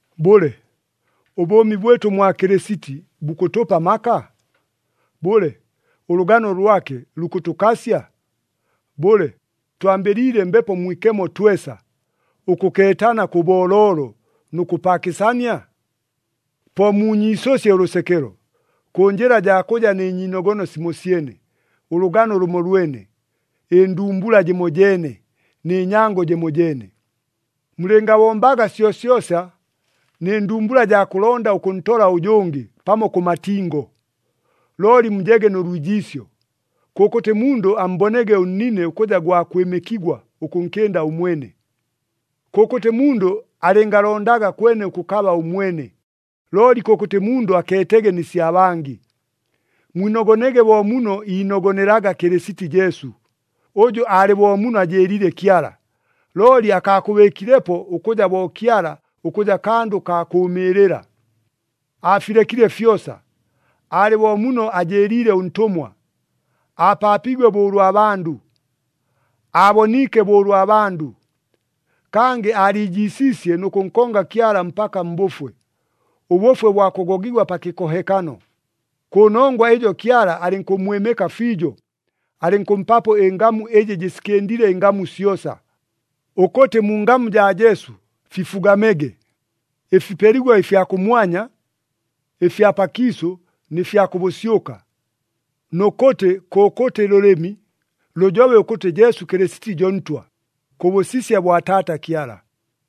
Bʉle, ʉbʉʉmi bwɨtʉ mwa Kɨlɨsiti bukʉtʉpa amaka? Bʉle, ʉlʉgano lwake lukʉtʉkasya? Bʉle, twambɨliile Mbepo Mwikemo twesa, ʉkʉkeetana kʉ booloolo nʉ kʉpaakɨsania? Po muunyiisʉsye ʉlʉsekelo, kʉ njɨla jaa kʉja nɨ nyiinogono simosyene, ʉlʉgano lʉmolwene, ɨndumbula jɨmojeene, nɨ nyango jɨmojeene. Mulɨngabombaga syosyosa nɨ ndumbula jaa kʉlonda ʉkʉntola ʉjʉngɨ pamo kʉ matingo, looli mujege nʉ lwijiisyo. Kʉkʉtɨ mundʉ ammbonege ʉnnine ʉkʉja gwa kwɨmɨkigwa ʉkʉnkɨnda ʉmwene. Kʉkʉtɨ mundʉ alɨngalondaga kwene ʉkʉkaba ʉmwene, looli kʉkʉtɨ mundʉ akeetege nɨ sya bangɨ. Mwinogonege bo muno iinogonelaga Kɨlɨsiti Jesu, ʉjʉ alɨ bo muno ajɨɨliile Kyala, looli akaakʉbɨɨkilepo ʉkʉja bo Kyala ʉkʉja kandʉ kaa kʉkʉʉmɨɨlɨla. Aafilekile fyosa, aalɨ bo muno ajɨɨliile ʉntʉmwa, aapaapiigwe bo ʉlwa bandʉ. Aaboniike bo ʉlwa bandʉ, kangɨ aaliijiisiisye nʉ kʉnkonga Kyala mpaka mbʉfwe, ʉbʉfwe bwa kʉgogigwa pa kɨkohekano. Kʉnongwa ɨjo Kyala alɨnkʉmmwɨmɨka fiijo. Alɨnkʉmpapo ɨngamu ɨjɨ jɨsikɨndile ɨngamu syosa, ʉkʉtɨ mu ngamu jaa Jesu fifugamege, ɨfipeligwa ɨfya kʉmwanya, ɨfya pakiisʉ nɨ fya kʉ bʉsyʉka, nʉ kʉtɨ kʉkʉtɨ lʉlɨmi lʉjobe ʉkʉtɨ Jesu Kɨlɨsiti jo Ntwa, kʉ bʉsisya bwa Taata Kyala.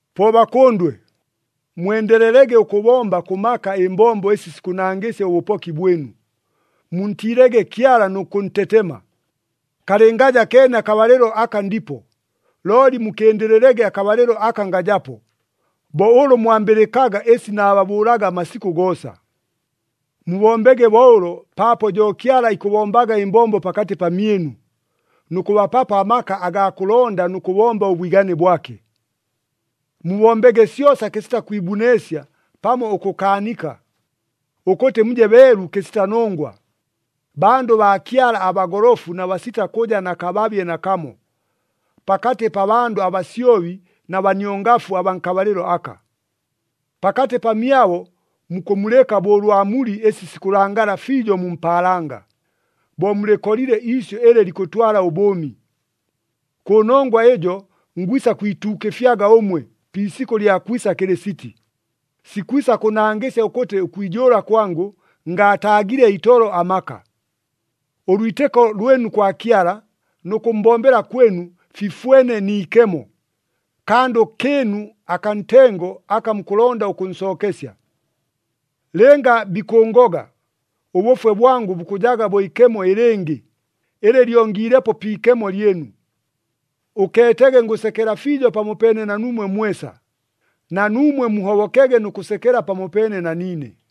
Po bakʉndwe, mwendelelege ʉkʉbomba kʉ maka ɨmbombo ɨsi sikʉnangɨsya ʉbʉpoki bwɨnu. Muntiilege Kyala nʉ kʉntetema, kalɨngaja keene akabalɨlo aka ndipo, looli mukɨndɨlɨlege akabalɨlo aka ngajapo, bo ʉlʉ mwambɨlɨkaga ɨsi naababʉʉlaga amasikʉ goosa. Mubombege bo ʉlo paapo jo Kyala ikʉbombaga ɨmbombo pakatɨ pamyɨnu, nʉ kʉbapapo amaka agaa kʉlonda nʉ kʉbomba ʉbwigane bwake. Mubombege syosa kɨsita kwibuneesya pamo ʉkʉkaanika, ʉkʉtɨ muje beelu kɨsita nongwa, bandʉ baa Kyala abagolofu na basita kʉja na kababye nakamo, pakatɨ pa bandʉ abasyobi na baniongafu abaa nkabalɨlo aka. Pakatɨ pamyabo mukʉmulɨka bo ʉlwa mulɨ ɨsi sikʉlangala fiijo mu mpaalanga, bo mulɨkolile iisyʉ ɨlɨ likʉtwala ʉbʉʉmi. Kʉnongwa ɨjo ngwisa kwituukɨfyaga ʉmwe pi isikʉ lya kwisa Kɨlɨsiti, sikwisa kʉnangɨsya ʉkʉtɨ ʉkwijʉʉla kwangʉ, ngaataagile itolo amaka. Ʉlwitɨko lwɨnu kwa Kyala nʉ kʉmmbombela kwɨnu fifwene ni ikemo, kandʉ kɨɨnu akaa ntengo aka mukʉlonda ʉkʉnsookesya. Lɨnga bikʉʉngoga, ʉbʉfwe bwangʉ bukʉjaga bo ikemo ɨlɨngɨ, ɨlɨ lyongiilepo pi ikemo lyɨnu. Ʉkeetege ngʉsekela fiijo pamopeene na nuumwe mwesa. Na nuumwe muhobokege nʉ kʉsekela pamopeene na niine.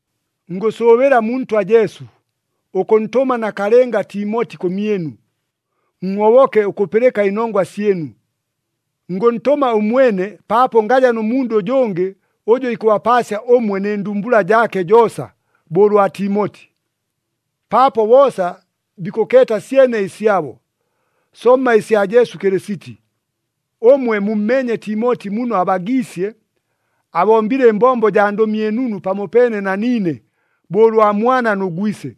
Ngʉsʉʉbɨla mu Ntwa Jesu, ʉkʉntʉma nakalɨnga Timoti kʉmyɨnu, nhoboke ʉkʉpɨlɨka ɨnongwa syɨnu. Ngʉntʉma ʉmwene paapo ngaja nʉ mundʉ ʉjʉngɨ ʉjʉ ikʉbapaasya ʉmwe nɨ ndumbula jaake joosa bo ʉlwa Timoti. Paapo boosa bikʉkeeta syene ɨsyabo, somma ɨsya Jesu Kɨlɨsiti. Ʉmwe mummeenye Timoti muno abagiisye, abombile ɨmbombo jaa Ndʉmi ɨNunu pamopeene na niine, bo ʉlwa mwana nʉ gwise.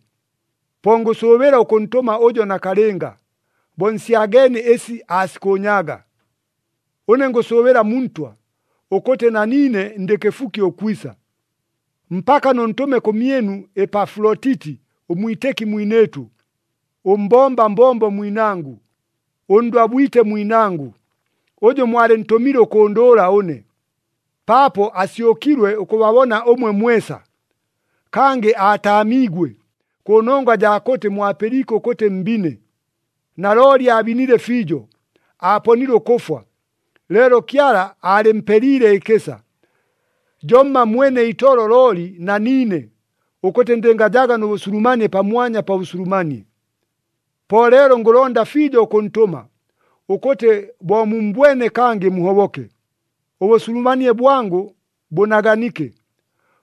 Po ngʉsʉʉbɨla ʉkʉntʉma ʉjo nakalɨnga, bo nsyageenie ɨsi aasikʉʉnyaaga. Ʉne ngʉsʉʉbɨla mu Ntwa, ʉkʉtɨ na niine ndɨ kɨfuki ʉkwisa. Mpaka nʉntʉme kʉmyɨnu Epafulotiti ʉmwitɨki mwinɨɨtʉ, ʉmbomba mbombo mwinangʉ, ʉndwabwite mwinangʉ, ʉjʉ mwalɨntʉmile ʉkʉndʉʉla ʉne, paapo asyʉkilwe ʉkʉbabona ʉmwe mwesa. Kangɨ aataamiigwe, kʉnongwa jaa kʉtɨ mwapɨliike ʉkʉtɨ mbine. Nalooli aabinile fiijo, aaponile ʉkʉfwa. Leelo Kyala aalɨmpeliile ɨkɨsa, jomma mwene itolo looli na niine, ʉkʉtɨ ndɨngajaga nʉ bʉsulumanie pamwanya pa bʉsulumanie. Po leelo ngʉlonda fiijo ʉkʉntʉma, ʉkʉtɨ bo mummbwene kangɨ muhoboke, ʉbʉsulumanie bwangʉ bʉnaganike.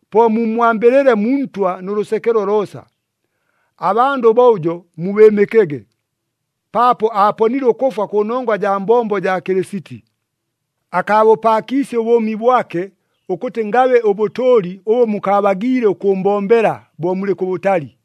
Po mummwambɨlɨle mu Ntwa nʉ lʉsekelo loosa. Abandʉ bo ʉjo, mubɨɨmɨkege, paapo aaponile ʉkʉfwa kʉnongwa jaa mbombo jaa Kɨlɨsiti. Akaabʉpaakiisye ʉbʉʉmi bwake ʉkʉtɨ ngabe ʉbʉtʉʉli ʉbʉ mukaabagiile ʉkʉʉmbombela bo mulɨ kʉbʉtali.